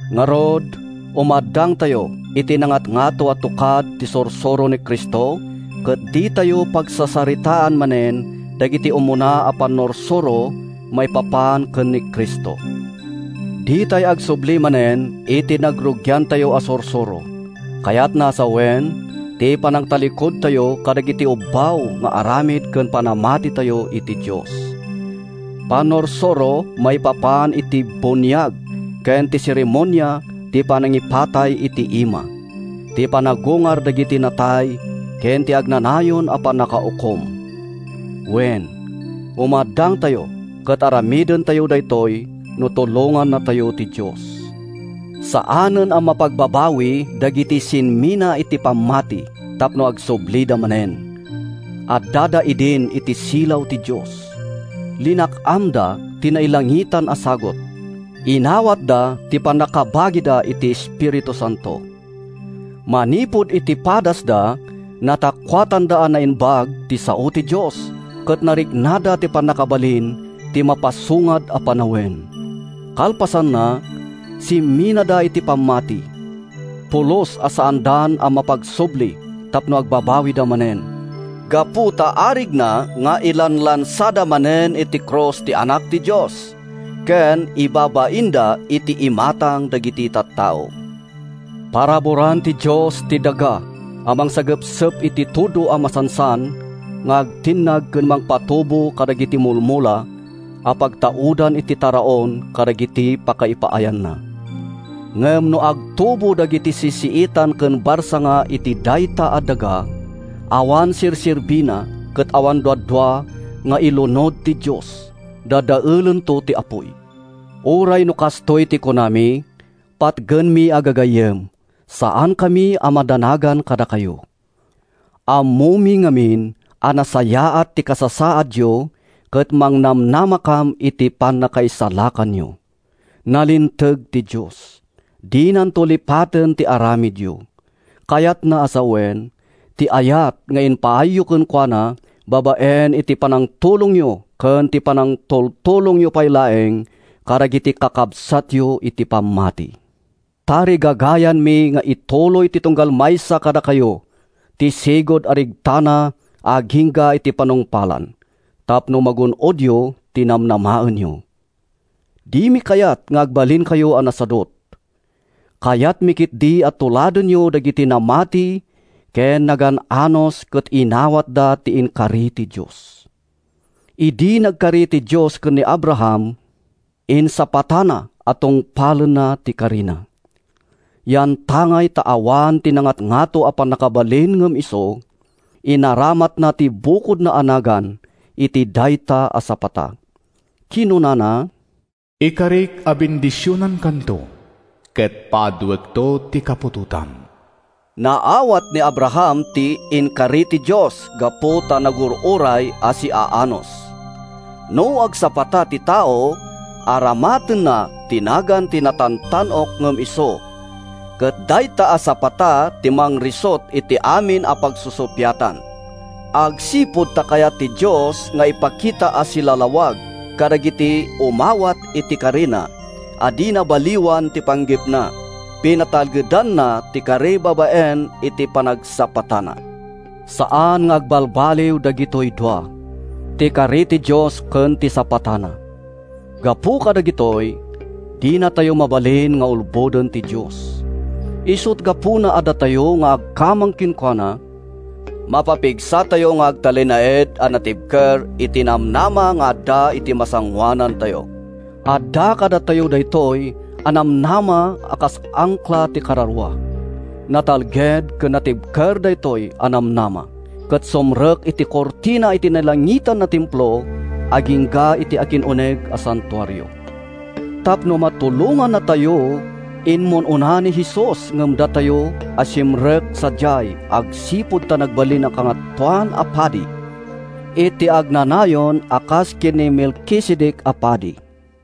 Ngarud, umaddangtayo iti nangatngato a tukad ti sursuro ni Cristo ket ditayo pagsasaritaan manen dagiti umuna a pannursuro maipapan ken ni Cristo. Ditay agsubli manen iti nangrugiantayo a sursuro, kayatna a sawen, ti panangtallikudtayo kadagiti ubbaw nga aramid ken panamatitayo iti Dios; pannursuro maipapan iti buniag ken ti seremonia ti panangipatay iti ima; ti panagungar dagiti natay ken ti agnanayon a pannakaukom. Wen, umaddangtayo, ket aramidentayo daytoy no tulongannatayo ti Dios. Saanen a mapagbabawi dagiti simmina iti pammati tapno agsublida manen. Addada idin iti silaw ti Dios. Linak-amda ti nailangitan a sagut. Inawatda ti pannakabagida iti Espiritu Santo. Manipud iti padasda, natakuatanda a naimbag ti sao ti Dios ket nariknada ti pannakabalin ti mapasungad a panawen. Kalpasanna, simminada iti pammati! Pulos a saandan a mapagsubli tapno agbabawida manen, gapu ta arigna nga ilanlansada manen iti krus ti Anak ti Dios ken ibabainda iti imatang dagiti tattao. Paraburan ti Dios ti daga a mangsagepsep iti tudo a masansan nga agtinnag ken mangpatubo kadagiti mulmula a pagtaudan iti taraon kadagiti pakaipaayanna. Ngem no agtubo dagiti sisiitan ken barsanga iti dayta a daga, awan serserbina ket awan duadua nga ilunod ti Dios—dadaelento ti apuy. Uray no kastoy ti kunami, patgenmi a gagayyem, saankami a madanagan kadakayo. Ammomi ngamin a nasayaat ti kasasaadyo ket mangnamnamakam iti pannakaisalakanyo. Nalinteg ti Dios. Dinanto lipaten ti aramidyo, kayatna a sawen, ti ayat nga impaayyo kenkuana babaen iti panangtulongyo ken ti panangtultulongyo pay laeng kadagiti kakabsatyo iti pammati. Tarigagaymi nga ituloy ti tunggal maysa kadakayo ti sigud a regtana agingga iti panungpalan tapno magun-odyo ti namnamaenyo. Dimi kayat nga agbalinkayo a nasadut. Kayatmi ketdi a tuladenyo dagiti namati ken nagan-anus ket inawatda ti inkari ti Dios. Idi nagkari ti Dios ken ni Abraham, insapatana a tungpalenna ti karina. Yantangay ta awan ti nangatngato a pannakabalin ngem isu, inaramatna ti bukodna a nagan iti dayta a sapata. Kinunana, “Ikarik a bendisionankanto ket paaduekto ti kaputotam.” Naawat ni Abraham ti inkari ti Dios gapu ta nagur-uray a siaanus. No agsapata ti tao, aramatenna ti nagan ti natantan-ok ngem isu, ket dayta a sapata ti mangrisut iti amin a pagsusuppiatan. Agsipud ta kayat ti Dios nga ipakita a silalawag kadagiti umawat iti karina a dina baliwan ti panggepna, pinatalgedanna ti kari babaen iti panagsapatana. Saan nga agbalbaliw dagitoy dua: ti kari ti Dios ken ti sapatana. Gapu kadagitoy, dinatayo mabalin nga ulboden ti Dios. Isut’ gapuna a datayo a nagkamang kenkuana, mapapigsatayo nga agtalinaed a natibker iti namnama nga adda iti masangoanantayo. Adda kadatayo daytoy a namnama a kas angkla ti kararua. Natalged ken natibker daytoy a namnama ket sumrek iti kurtina iti nailangitan a templo agingga iti akin-uneg a santuario. Tapno matulongannatayo, immun-una ni Jesus ngem datayo a simrek sadiay agsipud ta nagbalin a Kangatoan a Padi iti agnanayon a kas ken ni Melkisedec a padi.